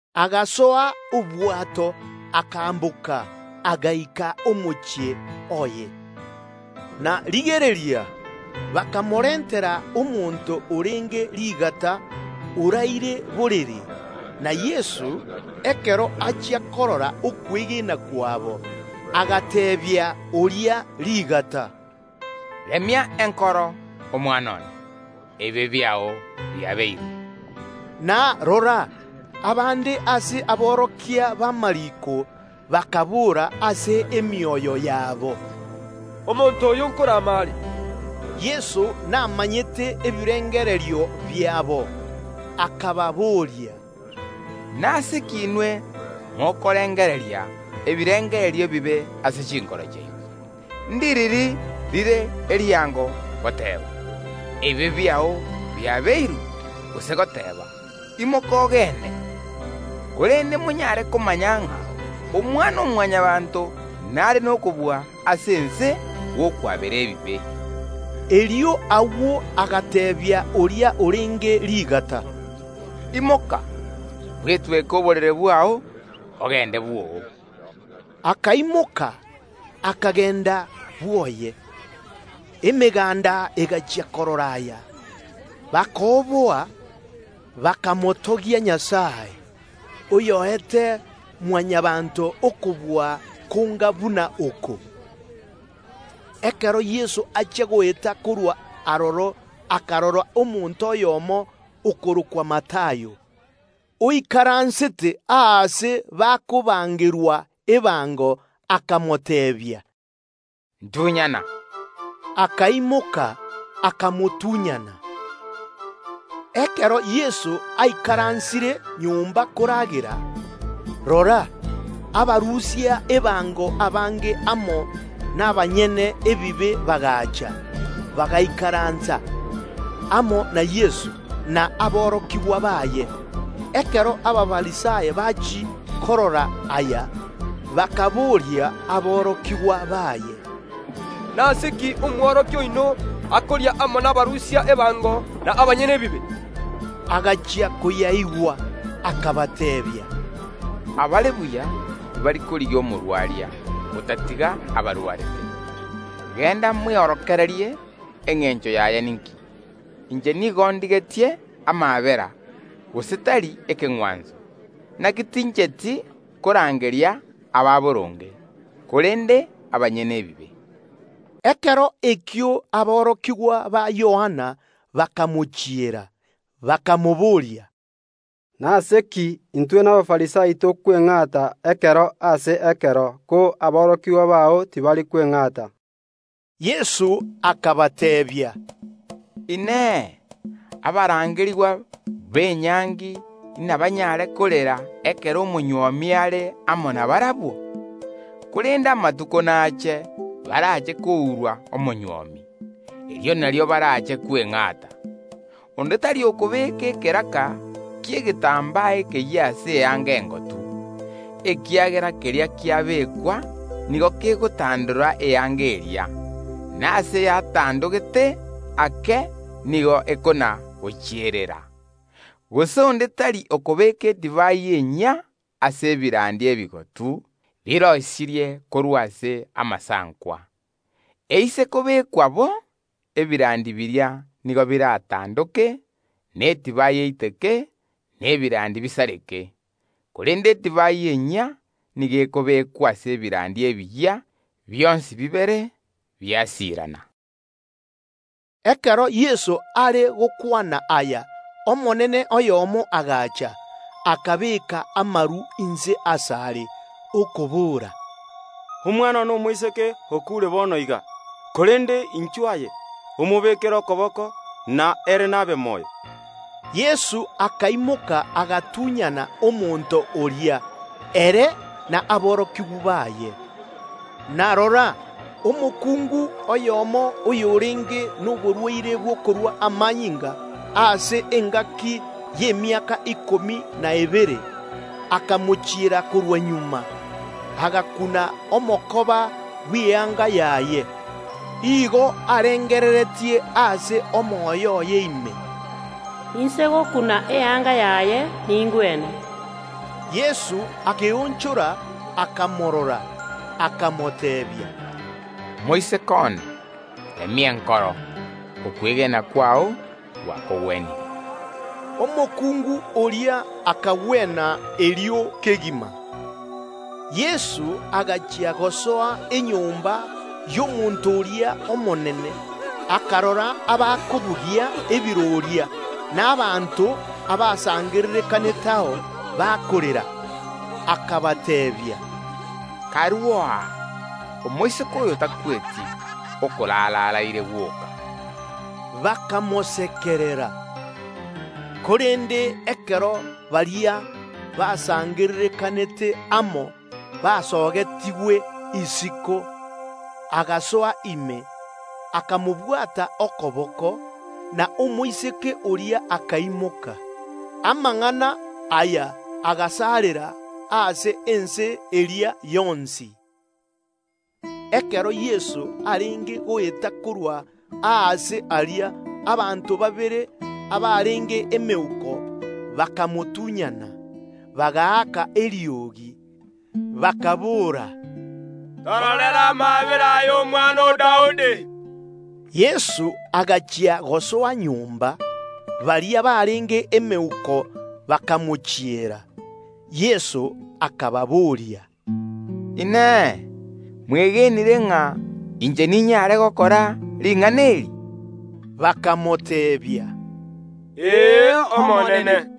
Agasoa obwato, akaamboka, agaika omochie oye. Na rigereria, bakamorentera omonto orenge rigata, oraire borere; na, ekero Yeso achia korora okwegena kwabo, agateebia oria rigata, “Remia enkoro, omwana one, ebibe biao biabeirwe.” Na rora, abande ase aborokia b’amariiko bakaboora ase emioyo yabo, “Omonto oyo ’nkorama are Nyasae.” Korende Yeso namanyete ebirengererio biabo, akababoria, “Nase ki inwe mokorengereria ebirengererio ebibe ase chinkoro chiaino? Ndiriri rire riango, goteeba: Ebibe biao biabeirwe, gose goteeba: Imoka ogende? Korende monyare komanya ng’a Omwana‐o‐Mwanyabaanto nare nokobua ase ense gw’okwabera ebibe.” Erio agwo agateebia oria orenge rigata, “Imoka, bwetweke egeseero ki’ao, ogende bwoo.” Akaimoka, akagenda bwoye. Emeganda egachia korora aya, bakooboa, bakamotogia Nyasae, oy’oete Mwanyabaanto okobua konga buna oko. Ekero Yeso achia goeta korwa aroro akarora omonto oyomo okorokwa Matayo, oikaransete aase enyomba ekoruserigwa ebango, akamoteebia, “Ntunyana!” Akaimoka, akamotunyana. Ekero Yeso aikaransire nyomba koragera, rora, abarusia ebango abange amo n’abanyabibe bagaacha, bagaikaransa amo na Yeso na aborokigwa baye. Ekero Abafarisai bachia korora aya, bakabooria aborokigwa baye, “Nase ki Omworokia oino akoria amo nabarusia ebango n’a banyabibe?” Agachia koyaigwa, akabateebia, “Abare buya tibari korigia omogwenia, otatiga abarwarete. Genda mweorokererie engencho yaye ninki: Inche nigo ndigetie amaabera, gose tari ekeng’wanso. Inaki tincheti korangeria abanyaboronge, korende abanyabibe.” Ekero ekio aborokigwa ba Yohana bakamochiera, bakamoboria, Nase ki intwe na Abafarisai tokweng’ata ekero ase ekero, ko aborokigwa bao tibari kweng’ata Yeso akabateebia, “Inee! Abarangerigwa b’enyangi inabanyare korera ekero omonywomi are amo nabarabwo? Korende amatuko nache, barache kourwa omonywomi; erio nario barache kweng’ata. Onde tari okobeka ekeraka ki’egetambaa ekeyia ase eyanga engotu, ekiagera keria kiabekwa nigo kegotandora eyanga eria, na ase yatandogete ake nigo ekona‐gochiererera. Gose onde tari okobeeka edivai enyia ase ebirandi ebigotu biroisirie korwa ase amasankwa. Eise kobekwa bo, ebirandi biria nigo biratandoke, na edivai eiteke, na ebirandi bisareke; korende edivai enyia nigo ekobekwa ase ebirandi ebiyia, bionsi bibere biasirana.” Ekero Yeso are gokwana aya, omonene oyomo agacha, akabeeka amaru inse asare, okobora, “Omwana one omoiseke okuure bono iga, korende inchwo aye, omobekere okoboko, na ere nabe moyo.” Yeso akaimoka agatunyana omonto oria, ere na aborokigwa baye. Na rora, omokungu oyomo oyorenge noborwaire bw’okorua amanyinga ase engaki y’emiaka ikomi na ebere, akamochiera korwa magega, agakuna omokoba bw’eyanga yaye. Igo arengereretie ase omoyo oye ime, “Inse gokuna eyanga yaye, ningwene.” Yeso akeonchora, akamorora, akamoteebia, “Moiseke one, remia enkoro; okwegena kwao gwakogwenirie.” Omokungu oria akagwena erio kegima. Yeso agachia gosoa enyomba y’omonto oria omonene, akarora ababugia ebiroria, na abanto basangererekaneteo bakorera. Akabateebia, “Karuo aa! Omoiseke oyo takweti, okorara araire gwoka.” Bakamosekerera. Korende ekero baria basangererekanete amo basogetigwe isiko, agasoa ime, akamobwata okoboko, na omoiseke oria akaimoka. Amang’ana aya agasarera ase ense eria yonsi. Ekero Yeso arenge goeta korwa aase aria, abanto babere barenge emeuko bakamotunyana, bagaaka eriogi, bakaboora, “Tororere amaabera, aye omwana o Daudi!” Yeso agachia gosoa nyomba, emeuko eria ekamochiera. Yeso akababoria, “Inee! Mwegenire ng’a inche ninyare gokora ring’ana eri?” Bakamoteebia, “Ee, Omonene.”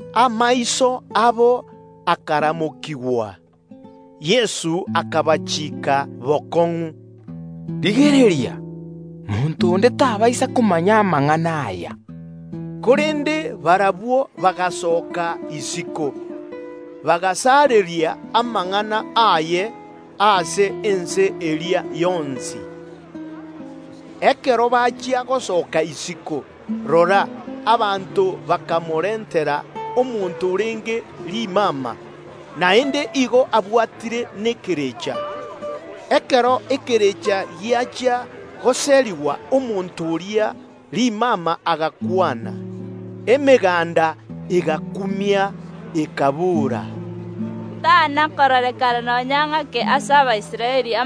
Amaiso abo akaramokigwa. Yeso akabatianera bokong’u, “Rigereria monto onde tabaisa komanya amang’ana aya.” Korende barabwo bagasoka isiko, bagasareria amang’ana aye ase ense eria yonsi. Ekero bachia gosoka isiko, rora, abanto bakamorentera omonto orenge rimama, naende nigo ere abwatire nekerecha. Ekero ekerecha giachia goserigwa, omonto oria rimama agakwana. Emeganda egakumia, ekabora, “Amang’ana anga buna aya tana kororekana nonya ng’ake ase Abaisraeli.”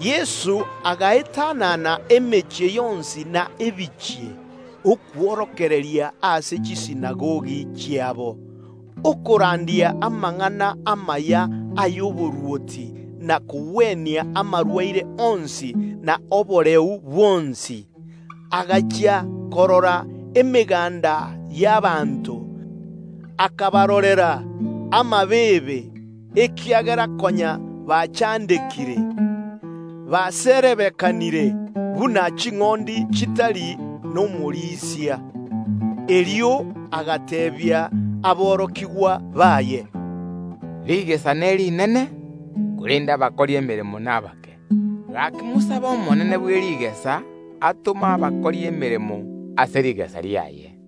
Yeso agaetanana emechie yonsi na ebinyoro, okworokereria ase chisinagogi chiabo, okorandia amang’ana amaya y’oborwoti na kogwenia amarwaire onsi na oboreu bwonsi. Agachia korora emeganda y’ abanto, akabarorera amabeebe, ekiagera konya bachandekire, baserebekanire buna ching’ondi chitari nomorisia. Erio agateebia aborokigwa baye, “Rigesa nerinene, korende abakori emeremo nabake; gaki mosabe Omonene bwe rigesa atome abakori emeremo ase rigesa riaye.”